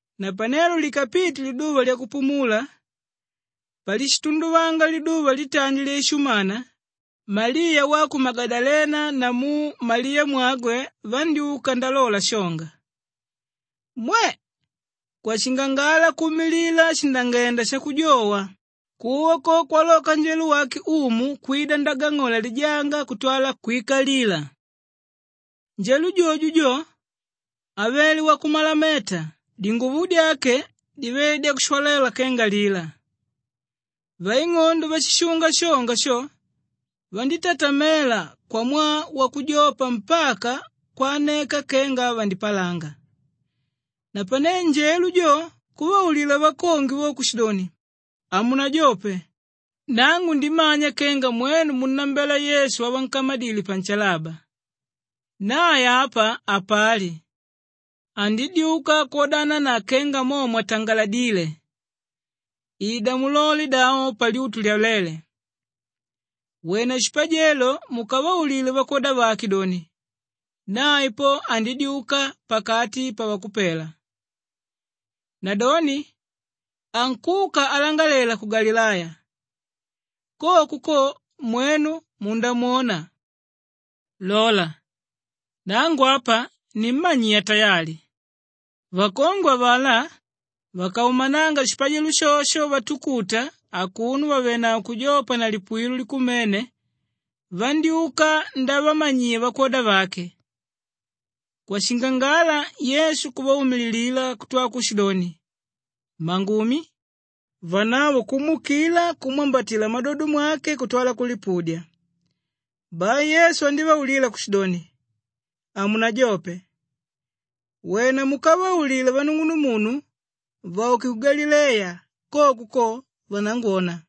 Napanelo likapite liduva lyakupumula, palishitunduvanga liduva litandi lyaishumana, Maliya wa ku Magadalena namu Maliyamwagwe vandyúka ndalola shonga. Mwe! Kwashingangala kuumilila shindangenda shakujowa, kuwa ko kwaloka njelo wake Umu kwida ndagang'ola lijanga kutwala kwikalila. Njelo jojo jo, avele wakumalameta, dinguvo dyake divele dyakushwalela kenga lila. Vaing'ondo váshishunga shonga sho vandítatamela kwamwaa wakujopa mpaka kwaneka kenga vandipalanga. Napane njelo jo kuvaulila vakongwe vo kushidoni, “Hamunajope! Nangu ndimanya kenga mwenu munnambela Yesu wavankamadile panshalaba. Nae apa hapali. Andidyuka kwodana na kenga mo mwatangaladíle. Ida mulole davo palyutu lyaléle. Wena shipajelo mukavaulile vakwoda vake doni, nae po andidyuka pakati pavakupela. Nadoni ankuka alangalela ku Galileya, koko ko mwenu mundamwona. Lola, nangu apa nimmanyiya tayali.” Vakongwe avalá vakaumananga shipajelo shosho vatukuta akuno vàvenavo kujopa na lipuwilo likumene, vandyúka ndavamanyiya vakwoda vake. Kwashingangala Yesu kuvaumililila kutwala kushidoni, “Mmangumi!” Vanavo kumuukila, kumwambatila mmadodo mwake kutwala kulipudya. Bai Yesu andívaulila kushidoni, “Hamunajope! Wena mukavaulile vanung'unuvangu vauke ku Galileya, koko ko vanangwona.”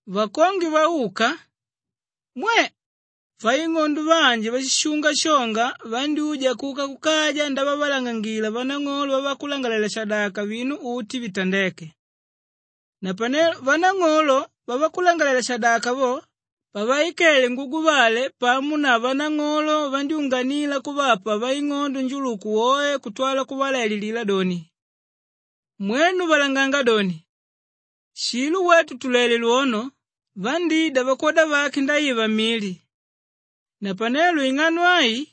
Vakongwe vauka, mwe! Vaing'ondo vanji váshishunga shonga vandyúja kuka kukaja ndavavalangangila vanang'olo vavakulangalalela-shadaka vinu uti vitandéke. Napane vanang'olo vavakulangalalela-shadaka vo pavaikele nguguvale pamo na vanang'olo vandyúnganila kuvapa vaing'ondo njuluku woe kutwala kuvalaililila doni, “Mwenu valanganga doni, ‘Shilo wetu tulele lwono, vandída vakwoda vake ndaiva mili.’ Napanelo ing'ano ai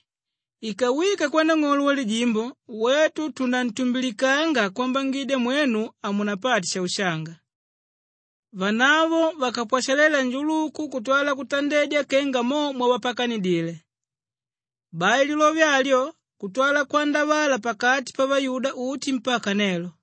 ikawika kwanang'olo walijimbo, wetu tunantumbilikanga kwambangidya mwenu hamunapate shaushanga.” Vanavo vakapwashalela njuluku kutwala kutandedya kenga momo mwavapakanidile. Bai lilove alyo kutwala kwandavala pakati pavayuda uti mpaka nelo.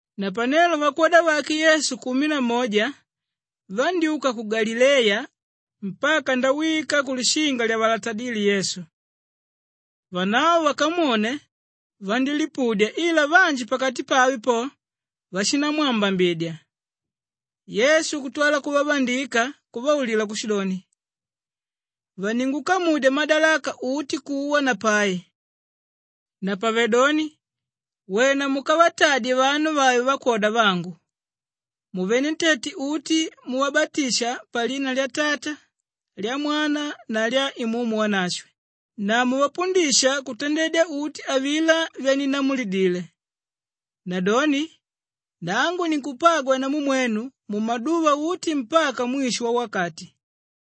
Napanelo vakwoda vake Yesu kumi na moja vandyúka ku Galileya mpaka ndawika kulishinga lyavalatadíle Yesu. Vanavo vakamwone, vandílipudya ila vanji pakati pave po, vashindamwambambidya. Yesu kutwala kuvavandika kuvaulila kushidoni, “Vaningukamudya madalaka uti kuwa na pai. Napavedoni wena mukavatadye vanu vave vakwoda vangu muvenentete uti muvabatisha palina lya Tata, lya Mwana na lya Imumu Wanashwe na muvapundisha kutandedya uti avilá vyaninnamulidile. Nadoni nangu ninkupagwa namu mwenu mumaduva uti mpaka mwisho wawakati.”